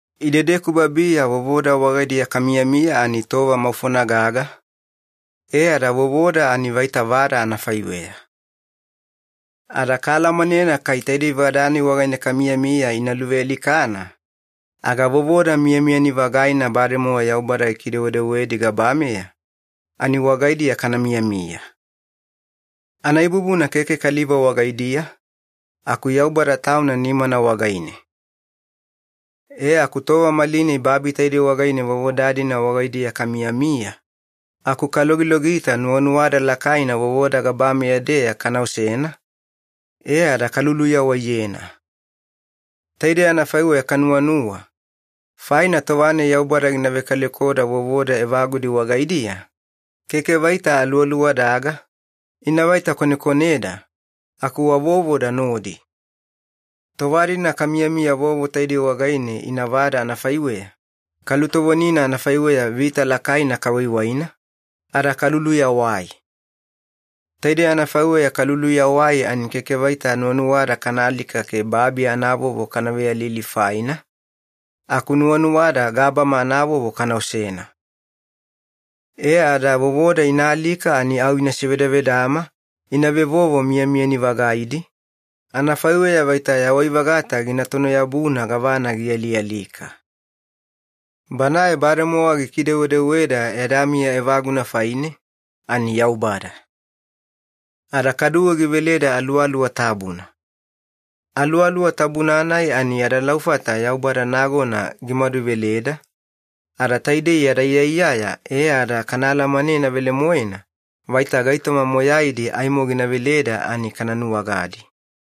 Idedeku babiya vovoda wagaidiya kamiyamiya ani tova maufona gaga, e ada vovoda ani vaita vada anafaiweya. Ada kaalamanena kai taidei vada-nai wagaine kamiyamiya ina luvealikana, aga vovoda miyamiyani-vagaina bademowa Yaubada gikidewedewedi gabameya, ani wagaidiya kana miyamiya. Anaibubuna keke kaliva wagaidiya, aku Yaubada Tauna nimana wagaine. E aku tova malinai babi taidei wagaine vovoda-dina wagaidiya kamiyamiya, aku kalogilogita nuwanuwada lakaina vovoda gabameya-deya kana osena, e ada kaluluyawaiyena. Taidei anafaiweya kanuwanuwa, faina tova-nai Yaubada gina vekalekoda vovoda evagudi wagaidiya, keke vaita aluwaluwadaga, ina vaita konekoneda, aku wa vovoda nodi. Tova-dina kamiyamiya vovo taidei wagaine ina vada anafaiweya, kalutovonina anafaiweya vita lakaina kawaiwaina, ada kaluluyawai. Taidei anafaiweya kaluluyawai ani keke vaita nuwanuwada kana alika ke babi anavovo kana veyalili faina, aku nuwanuwada gabama anavovo kana osena. E ada vovoda ina alika ani au ina sevedavedama ina vevovo miyamiyani-vagaidi, anafaiweya vaita yawai-vagata gina tono-yabuna gavana gialialika. Banae bademowa gikidewedeweda yada miya evaguna faine, ani Yaubada. Ada kaduwe giveleda Aluwaluwa Tabuna. Aluwaluwa Tabuna-nai ani yada laufata Yaubada nagona gimaduveleda, ada taidei yada iyaiyaya e ada kana alamanena velemoena vaita gaitoma moyaidi aimo gina veleda ani kana nuwagadi.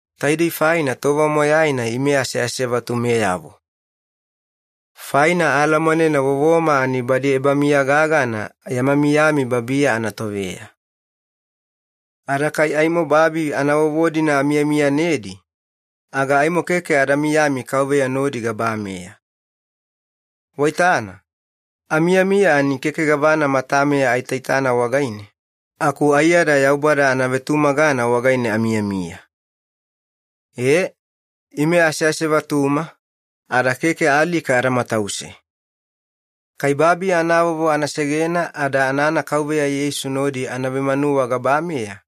Taidei faina tova moyaina ime aseasevatumeyavo. Faina aalamanena vovoma ani badi ebamiya gagana yama miyami babiya anatoveya. Ada kai aimo babi anavovo-dina amiyamiyanedi, aga aimo keke ada miyami Kauveya nodi gabameya. Waitana, amiyamiya ani keke gavana matameya aitaitana wagaine, aku aiyada Yaubada anavetumagana wagaine amiyamiya. E, ime aseasevatuma, ada keke alika ada matause. Kai babi anavovo ana segena ada anana Kauveya Yeisu nodi ana vemanuwa gabameya,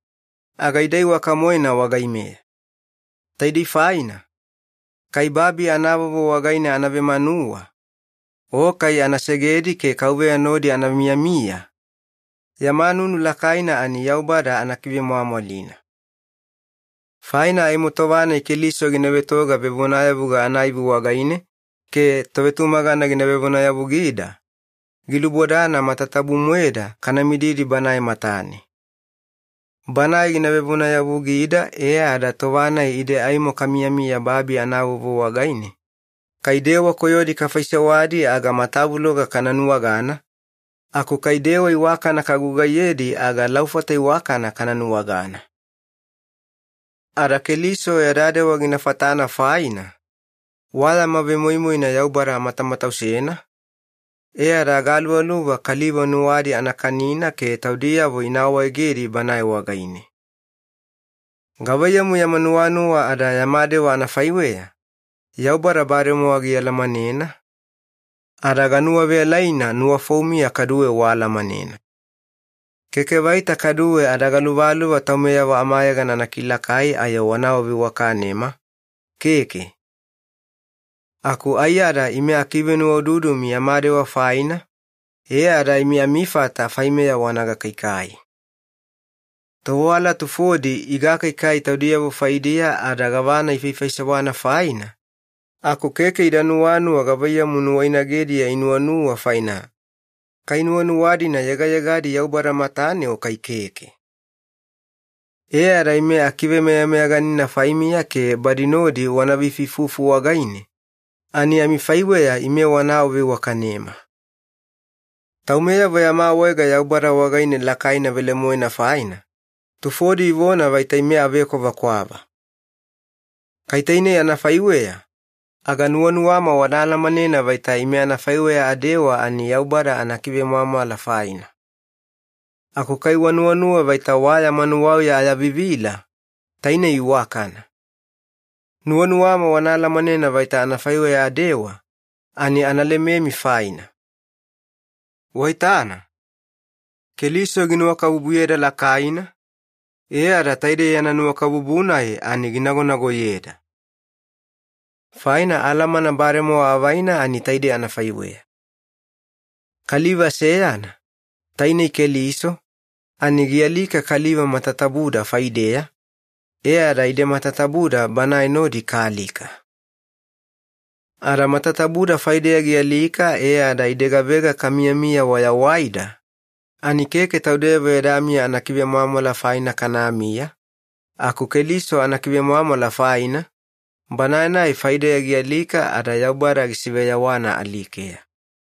aga ida iwaka-moena wagaimeya. Taidei faina, kai babi anavovo wagaine ana vemanuwa, o kai ana segedi ke Kauveya nodi ana miyamiya, yama nunu lakaina ani Yaubada ana kivemwamwalina. Faina aimo tova-nai Keliso gina vetoga vevonayavuga anaivi wagaine ke tovetumagana gina vevonayavugida, gilubodana matatabu-moeda kana mididi Banae matane. Banae gina vevonayavugida e ada tova-nai ide aimo kamiyamiya babi anavovo wagaine, kai dewa koyodi kafaisewadi aga matavuloga kana nuwagana, aku kai dewa iwakana kagugaiyedi aga laufata iwakana kana nuwagana. Ada Keliso yada dewa gina fatana faina, wa yama vemoimoina Yaubada amatamatausena, e ada agaluvaluva kaliva nuwadi ana kanina ke taudiyavo ina awaegedi Banae wagaine. Gavaiyamu yama nuwanuwa ada yama dewa anafaiweya, Yaubada bademowa gialamanena, ada ganuwaveyalaina nuwafoumiya kaduwe waalamanena. Keke vaita kaduwe ada galuvaluva taumeyavo amayegana ana kilakai ayo wana awaveiwakanema, keke. Aku aiyada ime akivenuwaududumi yama dewa faina, e ada imi amifata faimeya wana gakaikai. Tovewala tufodi igakaikai taudiyavo faidiya ada gavana ifaifaisewana faina, aku keke ida nuwanuwa gavaiyamu nuwainagediya inuwanuwa faina, kai nuwanuwa-dina yegayegadi Yaubada matane o kai keke. E ada ime akivemeyameyaganina faimiya ke badi nodi wana veifuifufu wagaine, ani amifaiweya ime wana awaveiwakanema. Taumeyavo yama awaega Yaubada wagaine lakaina velemoena faina, tufodi ivona vaita ime avekwavakwava. Kai tainei anafaiweya, aga nuwanuwama wana alamanena vaita ime anafaiweya adewa ani Yaubada anakivemwamwala faina. Aku kai wanuwanuwa vaita wa yama nuwauya ayavivila, tainei iwakana. Nuwanuwama wana alamanena vaita anafaiweya adewa, ani ana lememi faina. Waitana, Keliso ginuwakabubuyeda lakaina, e ada taide yana nuwakabubu-nai ani ginagonagoyeda. Faina alamana bademowa avaina ani taidei anafaiweya. Kaliva seyana, tainei Keliso, ani gialika kaliva matatabuda faideya, e ada ide matatabuda Banae nodi kaalika. Ada matatabuda faideya gialika e ada ide gavega kamiyamiya wayawaida, ani keke taudeyavo yada miya anakivemwamwala faina kanamiya, aku Keliso anakivemwamwala faina, Banae-nai faideya gialika ada Yaubada gisiveyawana alikeya.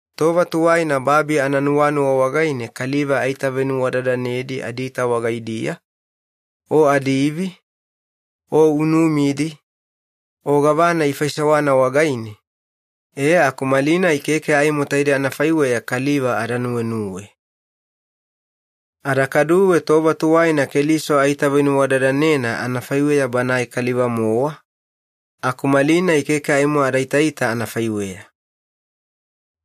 Tova tuwaina babi ananuwanuwa wagaine kaliva aitavenuwadadanedi adiita wagaidiya, o adiivi, o unumidi, o gavana ifaisewana wagaine, e aku malinai keke aimo taide anafaiweya kaliva ada nuwenuwe. Ada kaduwe tova tuwaina Keliso aitavenuwadadanena anafaiweya Banae kaliva-mowa, aku malinai keke aimo ada itaita anafaiweya.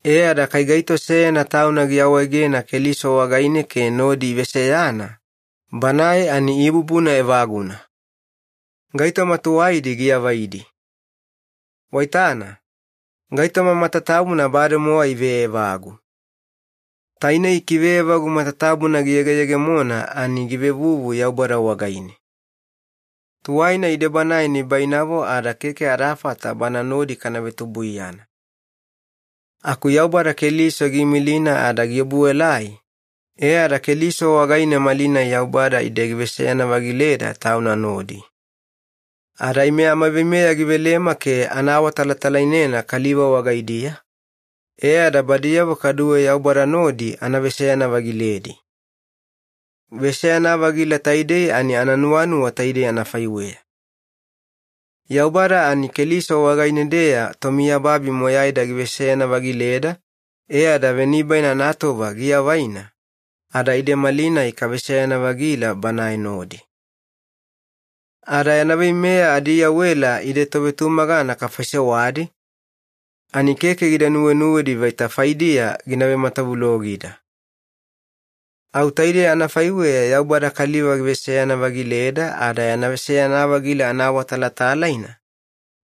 E ada kai gaito seyana tauna giawaegena Keliso wagaine ke nodi iveseyana, banae ani ibubuna evaguna. Gaitoma tuwaidi giavaidi. Waitana, gaitoma matatabuna bademowa iveevagu. Tainei kiveevagu matatabuna giyegeyegemona ani givevuvu Yaubada wagaine. Tuwaina ide Banae nibainavo ada keke adafata Bana nodi kana vetubuiyana. Aku Yaubada Keliso giimilina ada giobuelai, e ada Keliso wagaine malinai Yaubada ide giveseyana-vagileda Tauna nodi. Ada ime amaveimeya givelema ke ana awatalatalainena kaliva wagaidiya, e ada badiyavo kaduwe Yaubada nodi ana veseyana-vagiledi. Veseyana-vagila taidei ani ananuwanuwa taidei anafaiweya. Yaubada ani Keliso wagaine-deya tomiyababi moyaida giveseyana-vagileda e ada venibaina anatova giavaina, ada ide malinai kaveseyana-vagila Banae nodi. Ada yana veimeya adiiyawela ide tovetumagana kafaisewadi, ani keke gida nuwenuwedi vaita faidiya gina vematavulogida. Au taidei anafaiweya Yaubada kaliva giveseyana-vagileda ada yana veseyana-vagila anaawatalatalaina,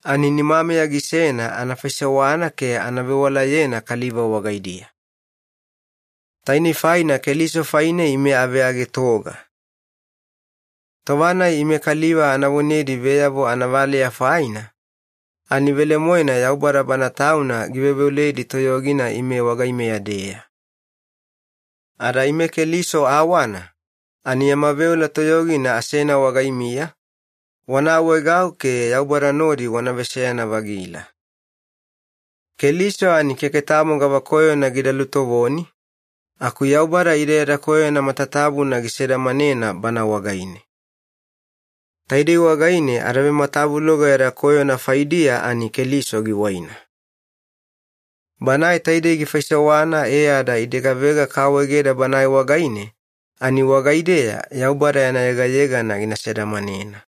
ani nimameya gisena ana faisewana ke ana vewalayena kaliva wagaidiya. Tainei faina Keliso faine ime aveagetoga. Tova-nai ime kaliva ana vonedi veyavo anavaleya faina, ani velemoena Yaubada Bana Tauna giveoveoledi toyogina ime wagaimeya-deya. Ada ime Keliso awana, ani yama veola toyogina asena wagaimiya, wana awaegau ke Yaubada nodi wana veseyana-vagila. Keliso ani keke tamo gavakoyona gida lutovoni, aku Yaubada ide yada koyona matatabuna gisedamanena Bana wagaine. Taidei wagaine adavematavuloga yada koyona faidiya ani Keliso giwaina. Banae taidei gifaisewana e ada ide gavega kaawaegeda Banae wagaine, ani wagaideya Yaubada yana yegayegana gina sedamanena.